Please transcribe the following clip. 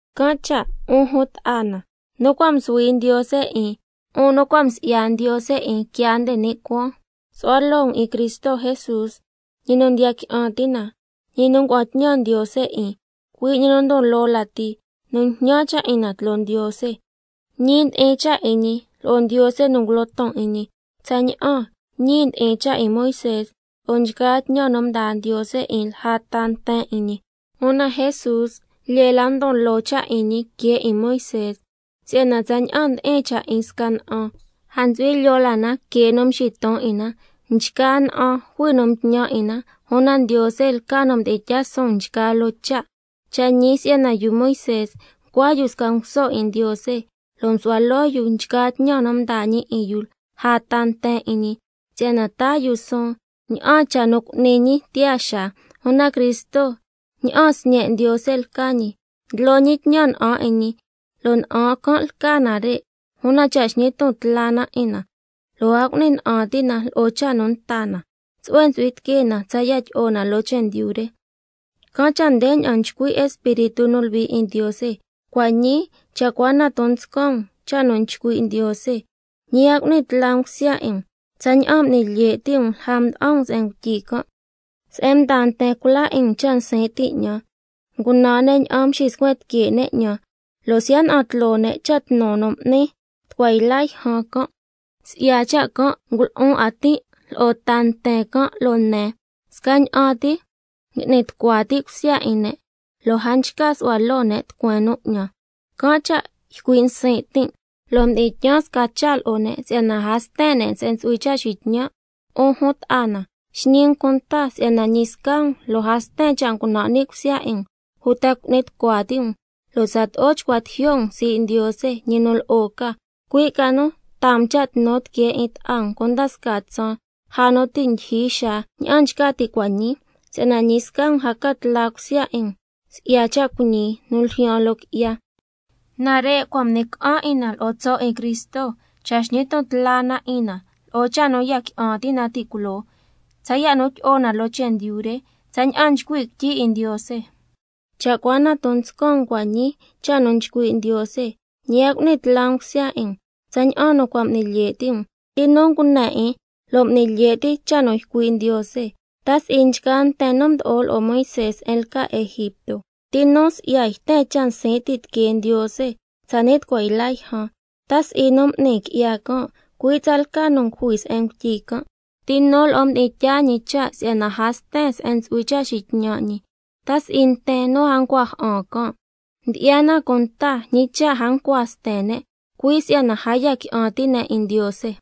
Can' cha', 'un jun ta'a na nu cua' msuhui Ndiose 'in, 'un nu cua' msi'ya Ndiose 'in quiaa nde ni' cuaan, su'hua loo um 'in Cristo Jesús, ñi nu ndiya qui'an ti' na, ñi nu ngua'an tñan Ndiose 'in, cui' ñi nu ndon loo lati nu njñan cha' 'in na tloo Ndiose. Ñi ndi'in cha' 'in ñi lo'o Ndiose nu ngulo ton 'in ñi, tsaña'an —ñi ndi'in cha' 'in Moisé lo'o nchgaa tñan nu mdaa Ndiose 'in lja ta nten 'in ñi—. Una Jesús lyee la ndon loo cha' 'in ñi que 'in Moisé, si'yana tsaña'an ndi'in cha' 'in sca na'an, a ntsu'hui lyoo la na que nu nxiton 'in na. Nchgaa na'an jui nu mtñan 'in na, una Ndiose lca nu mdi'in tyaa suun nchgaa loo cha'. Cha' ñi si'yana yu Moisé ncua yu sca nguso 'in Ndiose, lo' msu'hua loo yu nchgaa tñan nu mdaa ñi 'in yu lja ta nten 'in ñi, si'yana taa yu suun ña'an cha' nu cu'ni ñi tiyaa xaa. Una Cristo ña'an Sñe' Ndiose lca ñi, ndlo ñi tñan na'an 'in ñi, lo' na'an can' lca nare', una cha' xñi ton tla na 'in na, lo' a cu'ni na'an ti' na lo'o cha' nu nta na, tsu'hue ntsu'hui tiquee na tsaya' tyi'o na loo chendyu re. Can' cha' ndeña'an nchcui' Espíritu nu Luhui 'in Ndiose: —Cua' ñii cha' cua na ton nscan um cha' nu nchcui' Ndiose, ñi a cu'ni tla um cusya 'in um, tsaña'an m'ni lye' ti' um lja mda'an um se'en ngutyi can', se'en mdaa nten cula 'in um cha' nsin' ti' 'ñan, ngunan ña'an nxiscuen tique' 'ñan, lo' siya' na'an tloo ne' cha' nu tnu m'nin ni' tucua yla yjan can'. Si'ya cha' can' ngulu'un 'a tin' lo'o ta nten can', lo' nen: Scaña'an ti ngui'ni tucua ti' cusya 'in ne', lo' a nchca su'hua loo ne' tucueen nu 'ñan. Can' cha' ycui' nsin' tin' lo' mdi'in tyaan sca cha' lo'o ne' si'yana a sten ne' se'en ntsu'hui cha' xitñan'—. 'Un jun ta'a na, xñi um cunta si'yana ñi sca um lo' a sten cha' ngunan' ni' cusya 'in um uta cu'ni tucua ti' um lo' tsato'o chcua tijyo' um sii' Ndiose, ñi nu lo'o ca, cui' ca nu taa um cha' tnu tiquee 'in ta'a um cunda scaa tsaan, lja nu ti' ndyijyi xaa ña'an nchca ti' cua' ñii, si'yana ñi sca um a ca tla cusya 'in um si'ya cha' cuiñi nu ljyaan loo qui'ya. Nare' cua' m'ni ca'an 'in na lo'o tso' 'in Cristo, cha' xñi ton tla na 'in na lo'o cha' nu ya qui'an ti' na ti' culoo, tsaya' nu tyi'o na loo chendyu re, tsaña'an nchcui' quityi 'in Ndiose: —Cha' cua na ton nscan um cua' ñii cha' nu nchcui' Ndiose, ñi a cu'ni tla um cusya 'in um, tsaña'an nu cua' m'ni lye' ti' um—. ¿Ti nu ngune 'in lo' m'ni lye' ti' cha' nu ycui' Ndiose? ¿Ta si'i nchgaa nten nu mdo'o lo'o Moisé se'en lca Egipto? ¿Ti nu si'ya yten cha' nsin' ti' tiquee Ndiose tsani' tucua yla yjan? ¿Ta si'i nu m'ni qui'ya can', cui' tsalca nu ngujui se'en ngutyi can'? ¿Ti nu lo'o mdi'in tyaa ñi cha' si'yana a sten se'en ntsu'hui cha' xitñan' ñi? ¿Ta si'i nten nu a ncua ja'an can'? Ndyi'ya na cunta ñi cha' a ncua sten ne', cui' si'yana a ya qui'an ti' ne' 'in Ndiose.